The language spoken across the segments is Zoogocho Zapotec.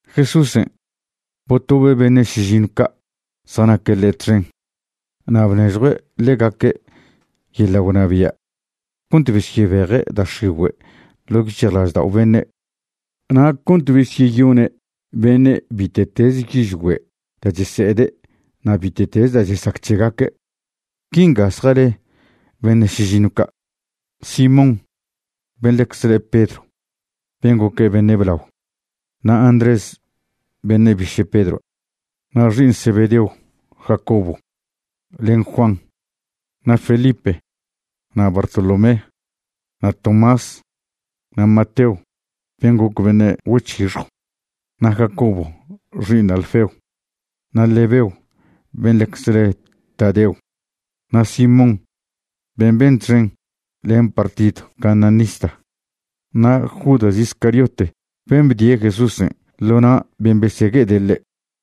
Jesúsen' botobe' beṉe' šižiṉw ca' zjanaque' ḻe' txen na' bnežjue' ḻegaque' yeḻa' gwnabia' cont besyebeje' da' x̱igüe' ḻo' yic̱hjlaždao' beṉe', na' cont besyeyone' beṉe' bite'teze yižgüe' da' chese'ede' na' bite'teze da' chesac c̱hegaque'. Quinga zjale beṉe' šižiṉw ca': Simón ben' ḻecze le' Pedro ben' goque' beṉe' blao, na' Andrés beṉe' biše' Pedroa', na' xi'iṉ Zebedeon' Jacobo len Juan, na' Felipe, na' Bartolomé, na' Tomás, na' Mateo ben' goc beṉe' güec̱hixjw, na' Jacobo xi'iṉ Alfeo, na' Lebeo ben' ḻecze le' Tadeo, na' Simón ben' ben txen len partidw cananista, na' Judas Iscariote ben' bdie' Jesúsen' ḻo na' ben' besegue'ede' ḻe'.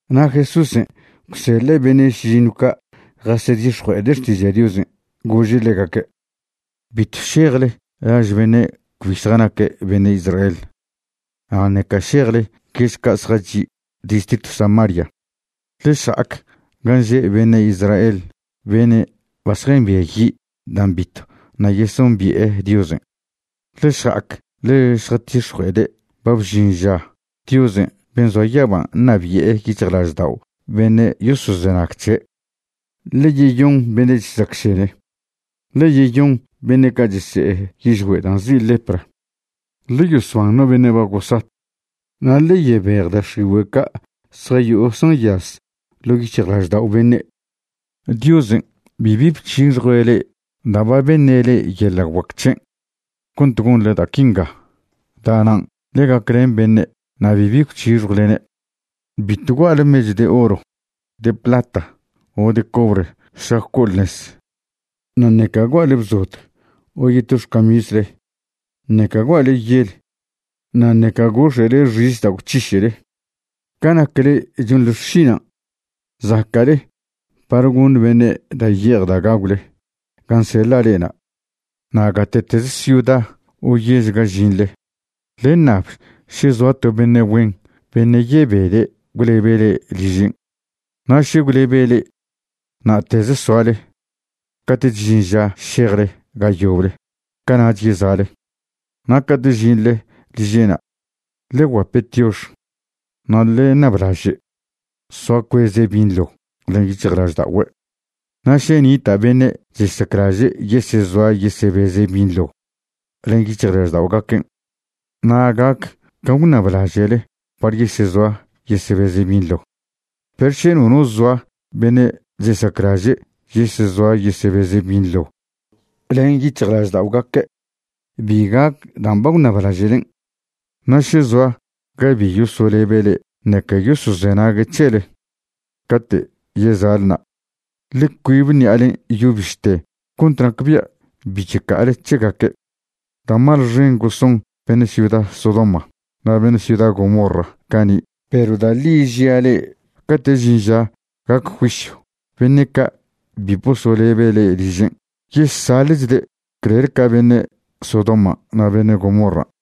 Na' Jesúsen' gwseḻe' beṉe' šižiṉw ca' jasedix̱jue'ede' xtiža' Diosen', gože' ḻegaque': ―Bitw šejle laž beṉe' cbi zjanaque' beṉe' Israel, na' ṉeca šejle yež ca' zjachi' distritw Samaria. Ḻe šja'ac gan' že' beṉe' Israel beṉe' ba zjambiayi' dan' bitw ṉa' yesombi'e Diosen'. Ḻe šja'ac ḻe šjatix̱jue'ede' ba bžin ža Diosen' ben' zoa yaban' ṉabi'e yic̱hjlaždao' beṉe' yosozenag c̱he'. Ḻe yeyon beṉe' chesacšene, ḻe yeyon beṉe' ca' chese'e yižgüe' dan' nzi' lepra, ḻe yosban no beṉe' ba gosat, na' ḻe yebej da' x̱igüe' ca' zjayo'o zjanyaz ḻo' yic̱hjlaždao' beṉe'. Diosen' bibi bc̱hixjue' le'e da' ba beṉe' le'e yeḻa' guac c̱hen' cont gonḻe da' quinga, da'nan' ḻe gaclen beṉe' na' bibi gwc̱hixjwlene'. ’Bitw gua'le mechw de oro, de plata o de cobre šlac co'ole nez. Na' ṉeca gua'le bzod, o yeto xcamisle, ṉeca gua'le yel, na' ṉeca gox̱e'le xis da' gwc̱hiše'le. Ca nac le'e chonḻe xšinan' zaca'le par goṉ beṉe' da' ye'ej da' gagwle gan' seḻa' le'ena'. ’Na' gate'tez ciuda o yež ga žinḻe, ḻe ṉab še zoa to beṉe' güen beṉe' yebede' gwlebe' le'e ližen'. Na' še gwlebe' le'e, na'teze soale. Cate'ch žin ža šejle ga yoble, cana'ch yeza'le. Na' cate' žinḻe liže'na', ḻe gwguape' tiox, na' ḻe ṉablaže' soa cueze' binḻo len yic̱hjlažda'ogüe'. Na' še nita' beṉe' chesaclaže' yesezoa yesebeze' binḻo len yic̱hjlažda'ogaquen', na' gac can' gwṉablaže'le par yesezoa yesebeze' binḻo. Perw še nono zoa beṉe' chesaclaže' yesezoa yesebeze' binḻo len yic̱hjlažda'ogaque', bi gac dan' ba gwṉablaže'len'. Na' še zoa ga bi yosolebe' le'e ṉeca yosozenague' c̱hele, cate' yeza'le na', ḻe cuibe ṉi'alen' yo bište cont nacbia' bi checa'ale c̱hegaque'. Da' mal xen goson beṉe' ciuda Sodoma na' beṉe' ciuda Gomorra cani', perw da' ḻi žia' le'e, cate' žin ža gac juisyw beṉe' ca' bi bosolebe' le'e ližen' yesaḻe'chde' clel ca beṉe' Sodoman' na' beṉe' Gomorran'.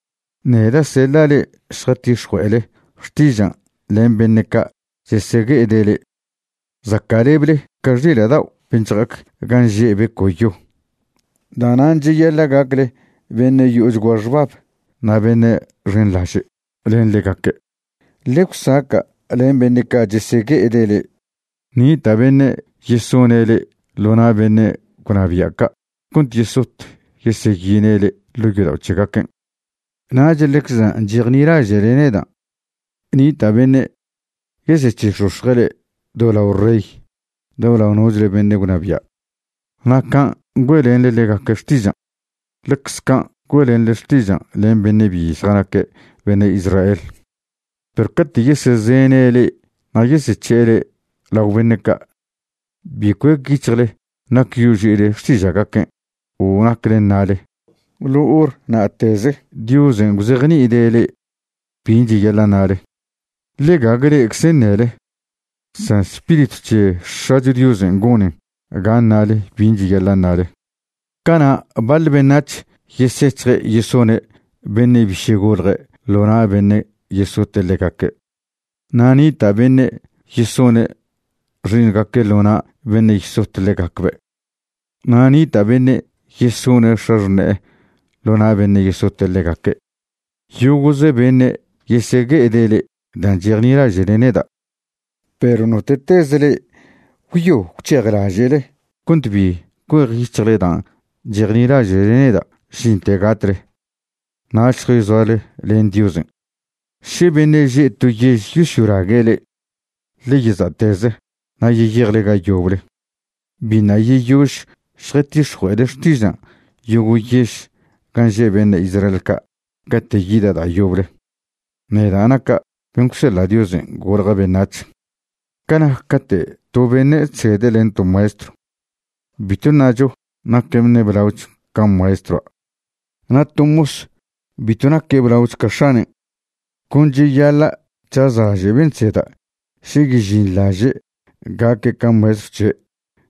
’Neda' seḻa' le'e šjatix̱jue'ele xtižan' len beṉe' ca' chesegue'ede' le'e. Zaca'leble ca xila' dao' ben' chja'ac gan' že' beco'yo. Da'nan' cheyaḻa' gacle beṉe' yo'ochgua xbab na' beṉe' xenḻaže' len ḻegaque'. Ḻe gwsaca' len beṉe' ca' chesegue'ede' le'e. Nita' beṉe' yesone' le'e ḻo na' beṉe' gwnabia' ca' cont yesot yeseyine' le'e ḻo' yodao' c̱hegaquen'. Nach ḻecze dan' chejnilaže'le neda' nita' beṉe' yesec̱he'ex̱ox̱je' le'e do lao rey, do lao nochle beṉe' gwnabia'. Na' can' güe'lenḻe ḻegaque' xtižan', ḻecze can' güe'lenḻe xtižan' len beṉe' bi zjanaque' beṉe' Israel. Perw cate' yesezene' le'e na' yesec̱he'e le'e lao beṉe' ca', bi cuec yic̱hjle nac yoži'ile xtiža'gaquen' o nacle ṉale. Ḻo hor na'teze Diosen' gwzejni'ide' le'e bin' cheyaḻa' ṉale. Ḻe gague le'eczen' ṉele, san Spiritw c̱he X̱acho Diosen' gonen ga ṉale bin' cheyaḻa' ṉale. ’Cana' baḻ beṉac̱h yesec̱hje' yesone' beṉe' biše' golje' ḻo na' beṉe' yesote' ḻegaque', na' nita' beṉe' yesone' xi'iṉgaque' ḻo na' beṉe' yesot ḻegacbe', na' nita' beṉe' yesone' x̱axṉe'e ḻo na' beṉe' yesote' ḻegaque'. Yogo'ze beṉe' yesegue'ede' le'e dan' chejnilaže'le neda', perw note'tez le'e gwyo gwc̱hejlaže'le cont bi cuejyic̱hjle dan' chejnilaže'le neda' žinten gatle, nach šjayzoale len Diosen'. Še beṉe' že' to yež yosyolague' le'e, ḻe yeza'teze na' yeyejle ga yoble. Biṉa' yeyož šjatix̱jue'ele xtižan' yogo' yež gan' že' beṉe' Israel ca' cate' yida' da' yoble, neda' naca' ben' gwseḻa' Diosen' golja' beṉac̱h. ’Ca nac cate' to beṉe' chsede' len to maestrw, bitw ṉacho naque' beṉe' blaoch ca maestroa'. Na' to mos bitw naque' blaoch ca x̱anen'. Con cheyaḻa' c̱hazlaže' ben' chseda' še yežinḻaže' gaque' ca maestrw c̱he'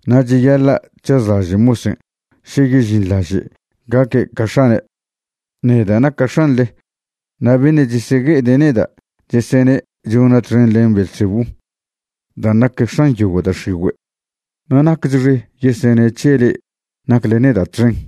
na' cheyaḻa' c̱hazlaže' mosen' še yežinḻaže' gaque' ca x̱anen'. Neda' naca' X̱anḻe, na' beṉe' chesegue'ede' neda' chesene' chona' txen len Beelzebú dan' nac x̱an yogo' da' x̱igüe', na' naquechxe yesene' c̱he le'e nacle neda' txen.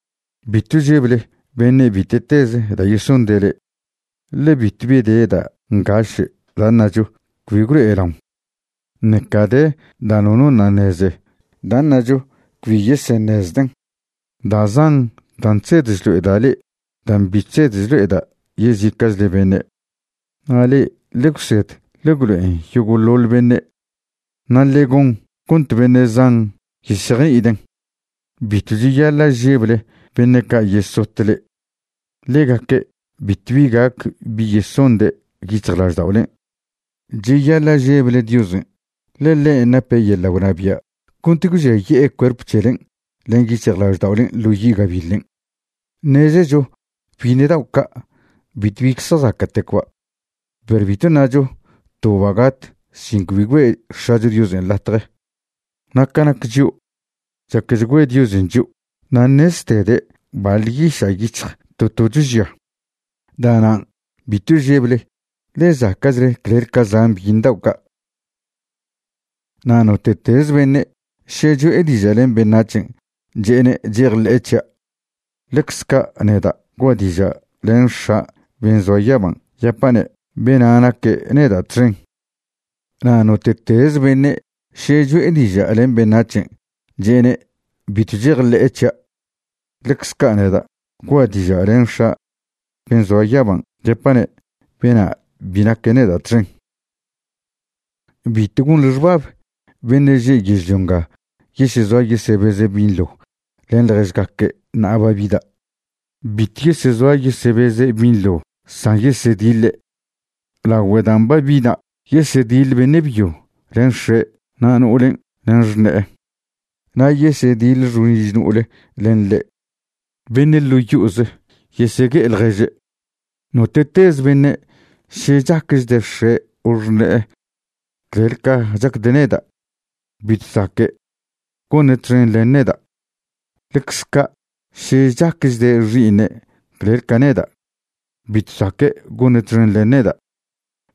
’Bitw žeble beṉe' bite'teze da' yesonde' le'e, ḻe bitwbi de da' ngaše' da' ṉacho cbi gwlo'elaon, ṉeca de da' nono ṉa' ṉeze da' ṉacho cbi yeseṉezden'. Da' zan dan' chsed chlo'eda' le'e dan' bi chsed chlo'eda' yezica'chle beṉe'. Na' le'e ḻe gwsed ḻe gwlo'en yogo'ḻoḻ beṉe', na' ḻe gon cont beṉe' zan yesejni'iden'. Bitw cheyaḻa' žeble beṉe' ca' yesot le'e. Ḻegaque' bitw gac bi yesonde' yic̱hjlažda'olen'. Cheyaḻa' žeble Diosen', ḻe ḻen' nape' yeḻa' gwnabia' cont gwžiaye'e cuerp c̱helen' len yic̱hjlažda'olen' ḻo yi' gabiḻen'. ’Ṉezecho byiṉe dao' ca' bitw bi zjazaca'tecba', perw bitw ṉacho toba' gat sin cbi güe' X̱acho Diosen' latje. Na' ca nac chio', chaquechgüe Diosen' chio' na' ṉeztede' baḻ yiša' yic̱hj to tocho žia. Da'nan', bitw žeble, ḻe zaca'chle clel ca zan byiṉ dao' ca'. ’Na' note'teze beṉe' še cho'e diža' len beṉac̱hen' che'ene' chejḻe'e c̱hia', ḻecze ca' neda' gua' diža' len X̱a' ben' zoa yaban' yapa'ne' bena' naque' neda' txen. Na' note'teze beṉe' še cho'e diža' len beṉac̱hen' che'ene' bitw chejḻe'e c̱hia', ḻecze ca' neda' gua' diža' len X̱a' ben' zoa yaban' yapa'ne' bena' bi naque' neda' txen. ’Bitw gonḻe xbab beṉe' že' yežlio nga yesezoa yesebeze' binḻo len ḻježgaque' ṉa'a ba bida'. Bitw yesezoa yesebeze' binḻo san yesediḻe'. Lagüe dan' ba bida' yesediḻ beṉe' byo len x̱e' na' no'olen' len xṉe'e, na' yesediḻ xo'oliž no'ole len ḻe'. Beṉe' ḻo' yo'oze yesegue'e ḻježe'. ’Note'tez beṉe' še chaquechde' x̱e' o xṉe'e clel ca chacde' neda', bitw zaque' gone' txen len neda'. Ḻecze ca' še chaquechde' xi'iṉe' clel ca neda' bitw zaque' gone' txen len neda'.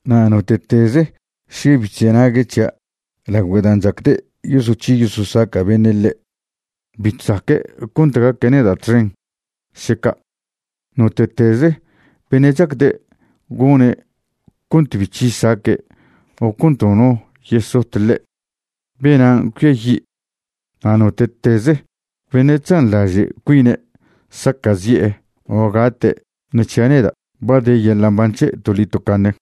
Na' note'teze' še bi chzenague' c̱hia' lagüe' dan' chacde' yosoc̱hi yososaca' beṉe' ḻe', bitw zaque' cont gaque' neda' txen še ca'. Note'teze beṉe' chacde' gone' cont bi c̱hi saque' o cont nono yesot ḻe', benan' cuiayi'. Na' note'teze beṉe' chzanḻaže' cuine' saca'zi'e o gate' ṉe c̱hia' neda, ba de yeḻa' mban c̱he' toḻi tocaṉe.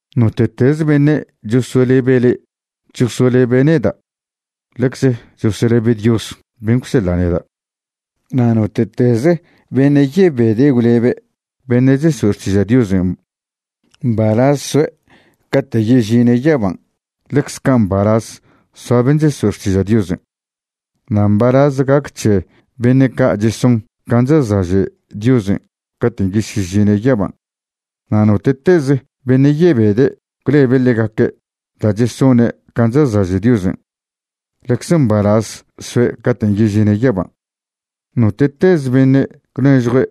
’Note'teze beṉe' chosolebe' le'e chosolebe' neda', ḻecze chosolebe' Dios ben' gwseḻe' neda'. Na' note'teze beṉe' yebede' gwlebe' beṉe' cheso'e xtiža' Diosen', mbalaz soe' cate' yežine' yaban' ḻecze ca mbalaz soa ben' cheso'e xtiža' Diosen'. Na' mbalaz gac c̱he beṉe' ca' cheson can' chazlaže' Diosen' caten' yesyežine' yaban'. Na' note'teze beṉe' yebede' gwlebe' ḻegaque' da' chesone' can' chazlaže' Diosen', ḻecze mbalaz soe' caten' yežine' yaban'. Note'teze beṉe' gwnežjue'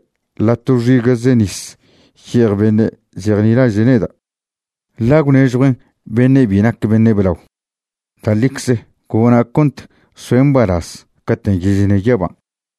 ḻa' to xiga'ze nis ye'ej beṉe' chejnilaže' neda', ḻa' gwnežjuen' beṉe' bi naque' beṉe' blao, da' ḻicze gona' cont soe' mbalaz caten' yežine' yaban'.